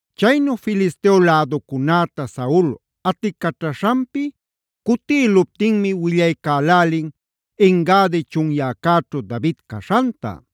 Chaynu Filisteo läducunäta Saul aticaćhaśhanpi cutïluptinmi willaycälälin En-gadi chunyäcäćhu David caśhanta.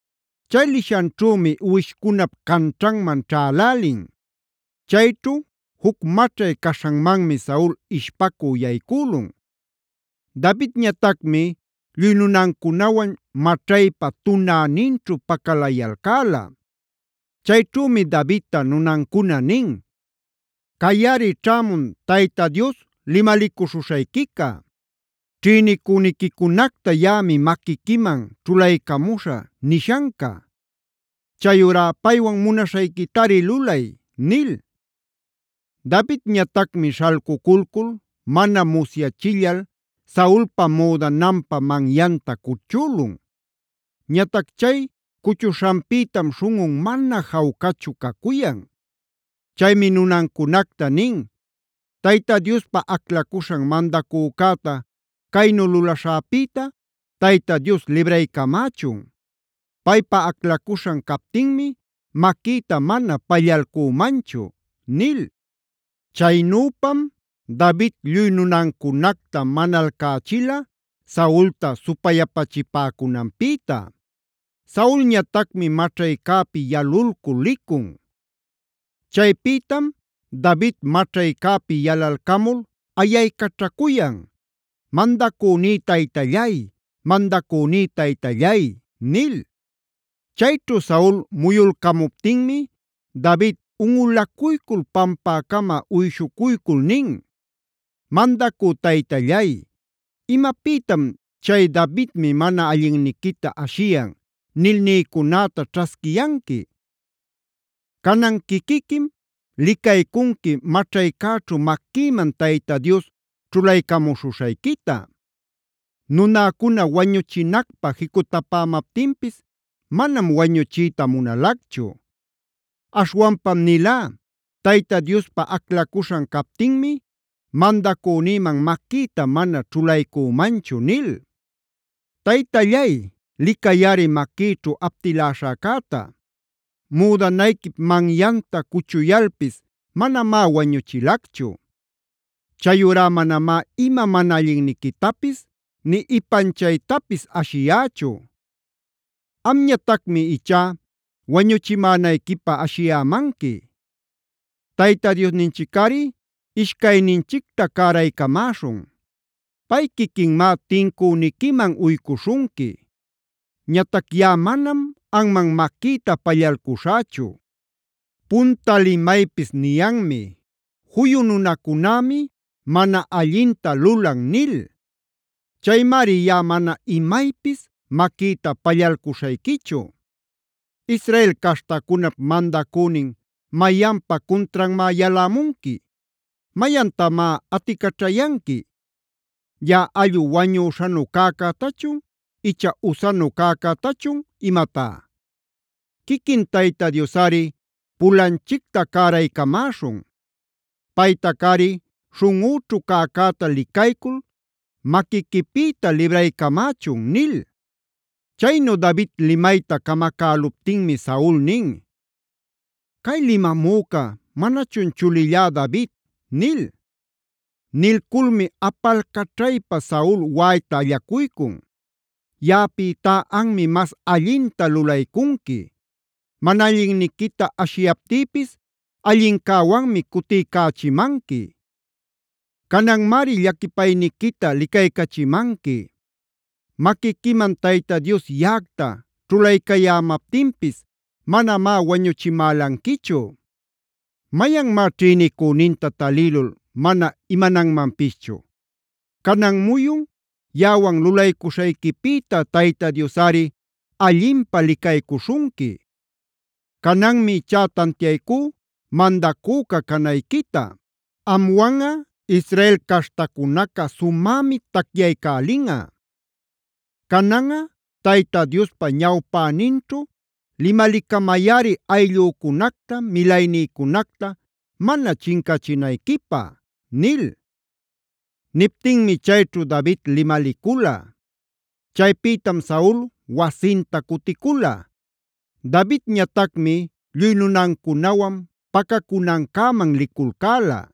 Chay lishanćhümi uwishcunap canćhanman ćhälälin. Chayćhu juc maćhay caśhanmanmi Saul ishpacü yaycülun. Davidñatacmi lluy nunancunawan maćhaypa tunäninćhu pacalayalcäla. Chayćhümi Davidta nunancuna nin: “Cayꞌari ćhämun Tayta Dios limalicuśhuśhayquica: ‘Ćhïnicüniquicunacta yaꞌami maquiquiman ćhulaycamuśhä’ nishanca. Chayurá paywan munaśhayquitari lulay” nil. Davidñatacmi śhalcuculcul mana musyachillal Saulpa müdananpa manyanta cuchülun. Ñatac chay cuchuśhanpïtam śhunꞌun mana jawcachu cacuyan. Chaymi nunancunacta nin: “Tayta Diospa aclacuśhan mandacücäta caynu lulaśhäpïta Tayta Dios libraycamächun. Paypa aclacuśhan captinmi maquïta mana pallalcümanchu” nil. Chaynüpam David lluy nunancunacta manalcächila Saulta supayapachipäcunanpïta. Saulñatacmi maćhaycäpi yalulcul licun. Chaypïtam David maćhaycäpi yalalcamul ayaycaćhacuyan: “Mandacüní taytallay, mandacüní taytallay” nil. Chayćhu Saul muyulcämuptinmi David unꞌulacuycul pampäcama uyshucuycul nin: “Mandacü taytallay, ¿imapïtam chay ‘Davidmi mana allinniquita ashiyan’ nil nïcunäta ćhasquiyanqui? Canan quiquiquim licaycunqui maćhaycäćhu maquïman Tayta Dios ćhulaycamuśhuśhayquita. Nunäcuna wañuchinacpä jicutapämaptinpis manam wañuchiyta munalacchu. Aśhwanpam nilá: ‘Tayta Diospa aclacuśhan captinmi mandacünïman maquïta mana ćhulaycümanchu’ nil. “Taytallay, licayꞌari maquïćhu aptiläśhäcäta. Müdanayquip manyanta cuchuyalpis manamá wañuchilacchu. Chayurá manamá ima mana allinniquitapis nï ipanchaytapis ashiyächu. Amñatacmi ichá wañuchimänayquipä ashiyämanqui. Tayta Diosninchicꞌari ishcayninchicta cäraycamäśhun. Pay quiquinmá tincüniquiman uycuśhunqui. Ñatac yaꞌa manam anman maquïta pallalcuśhächu. Punta limaypis niyanmi: ‘Juyu nunacunämi mana allinta lulan’ nil. Chaymari yaꞌa mana imaypis maquïta pallalcuśhayquichu. ¿Israel caśhtacunap mandacünin mayanpa cuntranmá yalämunqui? ¿Mayantamá aticaćhayanqui? ¿¡Yaꞌa allꞌu wañüśhanu cäcätachun icha usanu cäcätachun imatá!? Quiquin Tayta Diosꞌari pulanchicta cäraycamäśhun. Paytacꞌari śhunꞌüćhu cäcäta licaycul maquiquipïta libraycamächun” nil. Chaynu David limayta camacäluptinmi Saul nin: “¿Cay limamüca manachun chulillá David?” nil. Nilculmi apalcaćhaypa Saul waꞌayta allacuycun: “Yaꞌapïtá anmi mas allinta lulaycunqui. Mana allinniquita ashiyaptïpis allincäwanmi cutiycächimanqui. Cananmari llaquipayniquita licaycachimanqui. Maquiquiman Tayta Dios yaꞌacta ćhulaycayämaptinpis manamá wañuchimälanquichu. ¿Mayanmá ćhïnicüninta talïlul mana imananmanpischu? Canan muyun yaꞌawan lulaycuśhayquipïta Tayta Diosꞌari allinpä licaycuśhunqui. Cananmi ichá tantiaycú mandacüca canayquita. Amwanꞌa Israel caśhtacunaca sumämi tacyaycälinꞌa. Cananꞌa Tayta Diospa ñawpäninćhu limalicamayꞌari ayllücunacta, milaynïcunacta mana chincachinayquipä” nil. Niptinmi chayćhu David limalicula. Chaypïtam Saul wasinta cuticula; Davidñatacmi lluy nunancunawan pacacunancäman liculcäla.